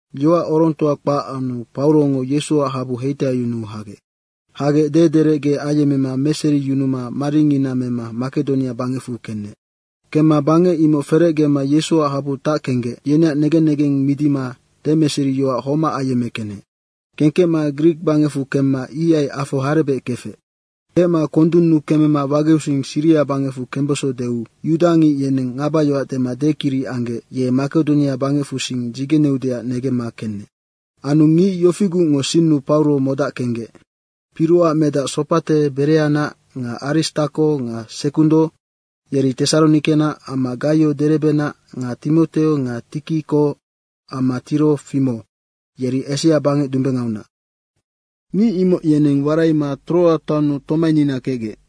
Yoac orongtoa kpac anu Paurongo Yesuac habu heitaiyunuu hagec. Hagec dederecge ayemmema meseriyunuma maringina mema Makedonia bangecfu kenec. Kemma bangec imoc ferecgema Yesuac habu tackenggec, yeneac negen negeng midima demeseriyoac homac ayemmekenec. Kengkecma Grik bangecfu kemma ihai afo harebec kefec. Kecma kondunnu kemema wageusing Siria bangecfu kembeso deu yudangic yeneng ngabayoac dema dekiric anggec ye Makedonia bangecfusing dzigeneudeac negemma kenec. Anu ngic yofigucngo sinnu Pauro modackenggec: Piroac medac Sopate Bereanac nga Aristako nga Sekundo yeri Tesaronikenac, amma Gaio Derebenac nga Timoteo nga Tikiko amma Tirofimo, yeri Asia bangec dumbengaunac. Ngic imoc yeneng waraima Troa taonnu tomainina kecgec.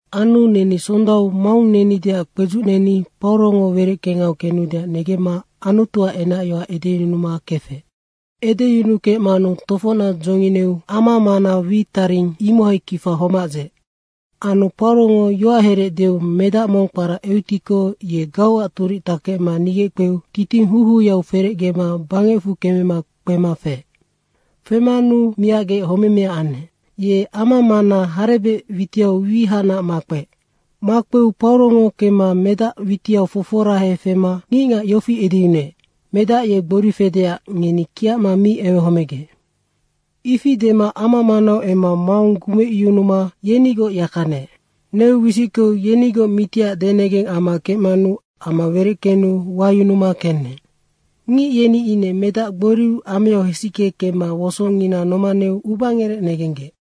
Anu neni sondau maung nenideac kpedzucneni Paurongo wereckengau kenudeac negemma Anutuac enacyoac edeyunuma kefec. Edeyunukecmanu tofocnac dzongineu amamana wi taring, imohai kifa homac dzeec. Anu Paurongo yoacherec deu medac mong kpara Eutiko, ye gauac turic takecma nigeckpeu titing houhouyau ferecgema bangecfu kemema kpema feec. Femanu miacgec homemea anec. Ye ama mana harebec witiau wi, ihacnac makpeec. Makpeu Paurongo kemema medac witiau foforahema fema ngicngac yofi edeyunuec, “Medac ye gbori fedeac ngeni kiacma mi ewehomegec.” Ifi dema ama manau emma maung gumecyunuma yenigoc yaka neec. Neu wisickeu yenigoc mitiac denegeng amma kecmanu ama wereckenu wayunuma kenec. Ngic yeni ine medac gboriu ameau hesicke kemma wosongina nomaneu ubangerec negenggec.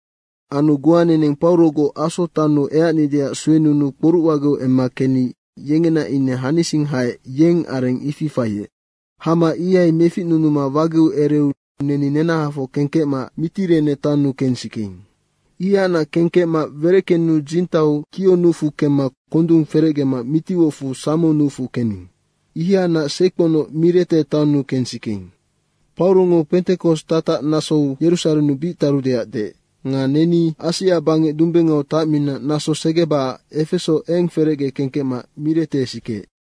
Anu goa neneng Paurogoc Aso taonnu eacnideac suenunuu kporuc wageu emma kenni yengena ine hanising haec, yeng areng ifi faiec. Hama ihai meficnunuma wageu ereu neni nenahafoc kengkecma Mitirene taonnu kensikeing. Ihanac kengkecma wereckenu dzintau Kio nucfu kemma kondung ferecgema mitiwocfu Samo nucfu kening. Ihanac seikponoc Mirete taonnu kensikeing. Paurongo pentekos tatac nasou Yerusarennu bic tarudeac deec. Nga neni Asia bangec dumbengau tacmina naso segebacac Efeso eng ferecge kengkecma Mirete sikeec.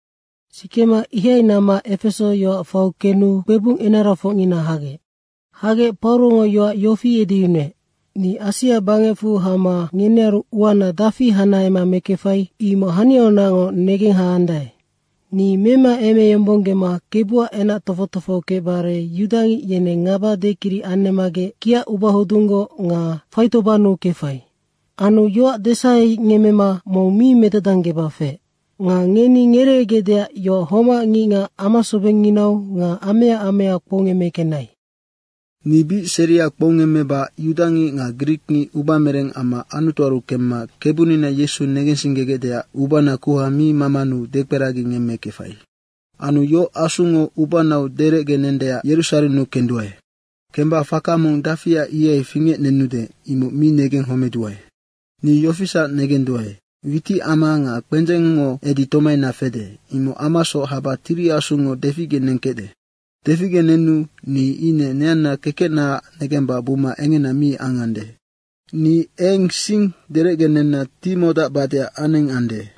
Sikema ihai namma Efeso yoac faiu kenu kpebung enarafocngina hagec. Hagec Paurongo yoac yofi edeyunuec, “Ni Asia bangecfu hama ngenearu uana dafi hanahema mekefai, imoc haniaunacngoc negenghaandae. Ni memaemeyombonggema Kebuac enac tofoc tofoho kecbare yudangic yeneng ngaba dekiric anemmagec kiacubahodunggoc nga faitobannu kefai. Anu yoac desahengemmema mong mi medadanggeba feec. Nga ngeni ngereegecdeac yoac homac ngicngac amasobengnginau nga amea amea kpoungemmekenai. Ni bic seria kpoungemmeba yudangic nga grikngic ubamereng amma Anutuaru kemma Kebunina Yesu negensinggegecdeac ubana kuha mi mamanu dekperagingemmekefai. Anu yoc Asungo ubanau derecgenendeac Yerusarennu kenduae. Kemba faka mong dafia ihai fingecnenude, imoc mi negenghomeduae. Ni yofisac negenduae, witicama nga kpendzengngo edi tomaina fede, imoc amasoc haba Tiri Asungo deficgenengkecde. Deficgenenu ni ine neanna kekecnaac negemba buma engena mi angande. Ni eng sing derecgenenna timodacbadeac anengande.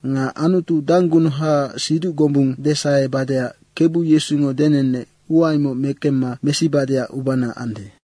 Nga Anutu danggunuhaac siduc gombung desahebadeac Kebu Yesungo denenec, ua imoc mekecma mesibadeac ubana ande.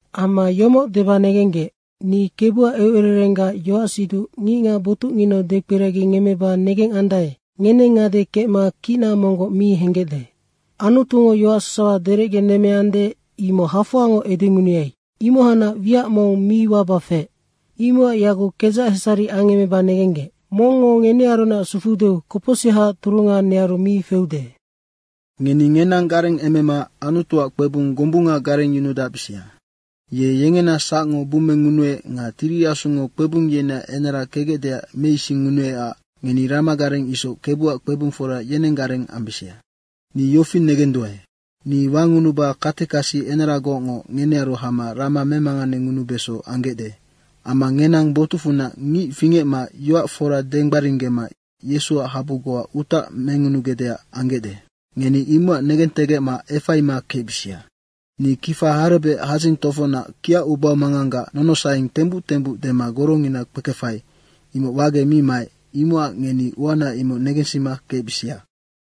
Amma yomoc deba negenggec, ni Kebuac eucererenggac yoacsiduc ngicngac botucnginau dekperagingemmeba negengandae, ngeneng ngade kecma kicna monggoc mi henggecde. Anutungo yoac sasawa derecgenemmeande, imoc hafoangoc edengunuai, imohacnac wiac mong mi waba feec. Imocac yaguc kedzac hesari angemmeba negenggec: mongngo ngenearunac sufuudeu kopocsihaac turunga nearu mi feude. Ngeni ngenang garengemema Anutuac kpebung gombunga garengyunudacbisia. Ye yengena sacngo bummengunuec nga Tiri Asungo kpebung yeneac enara kecgecdeac meisingngunuecac ngeni ramagareng isoc Kebuac kpebungfora yenenggareng ambisia. Ni yofi negenduae: Ni wangunuba katekasi enaragocngo ngenearu hama rama memanganengunubeso anggecde. Amma ngenang botucfunac ngic fingecma yoac fora denggbaringgema Yesuac habu goa utac mengunugecdeac anggecde. Ngeni imocac negentegecma efaima kecbisia. Ni kifa harebec hadzing tofocnac kiacubamanganggac nonosaeng tembuc tembuc dema gorongina kpekefai, imoc wagec mi maec, imocac ngeni uana imoc negensima kecbisia.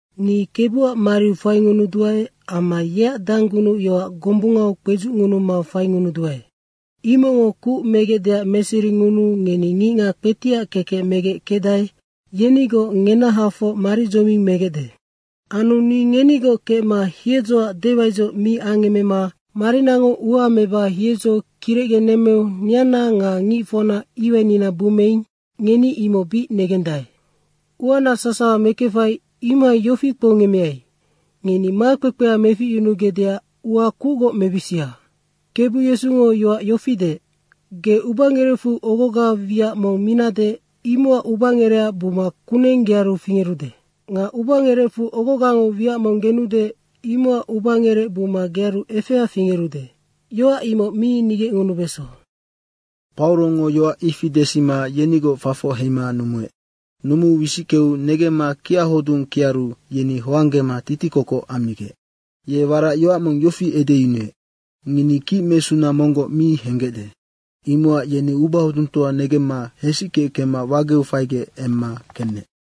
Ni Kebuac mariu faingunuduae amma yeac danggunucyoac gombungau kpedzucngunuma faingunuduae. Imocngo kuc megecdeac meseringunuu ngeni ngicngac kpetiac kekec megec kecdae, yenigoc ngenahafoc maridzoming megecde. Anu ni ngenigoc kecma hiedzoac dewaidzoc mi angemmema marinango ua meba hiedzo kirecgenemmeu neanna nga ngicfocna iwainina bummeing, ngeni imoc bic negendae. Uana sasawa mekefai, imohai yofi kpoungemmeai: Ngeni makpekpea meficyunugecdeac ua kucgoc mebisia. Kebu Yesungo yoac yofi deec, ‘Ge ubangerecfu ogoga wiac mong minade, imocac ubangerec buma kuneng gearu fingerude. Nga ubangerecfu ogogango wiac mong genude, imocac ubangerec buma gearu efea fingerude.’ yoac imoc mi nigecngunubeso.” Paurongo yoac ifi desima yenigoc fafoc heima numuec. Numuu wisickeu negemma kiachodung kiaru yeni hoanggema titikokoc ammigec. Ye warac yoac mong yofi edeyunuec, “Ngeni kicmesuna monggoc mi henggecde.” Imocac yeni ubahodungtoa negemma hesicke kemma wageu faigec emma kenec.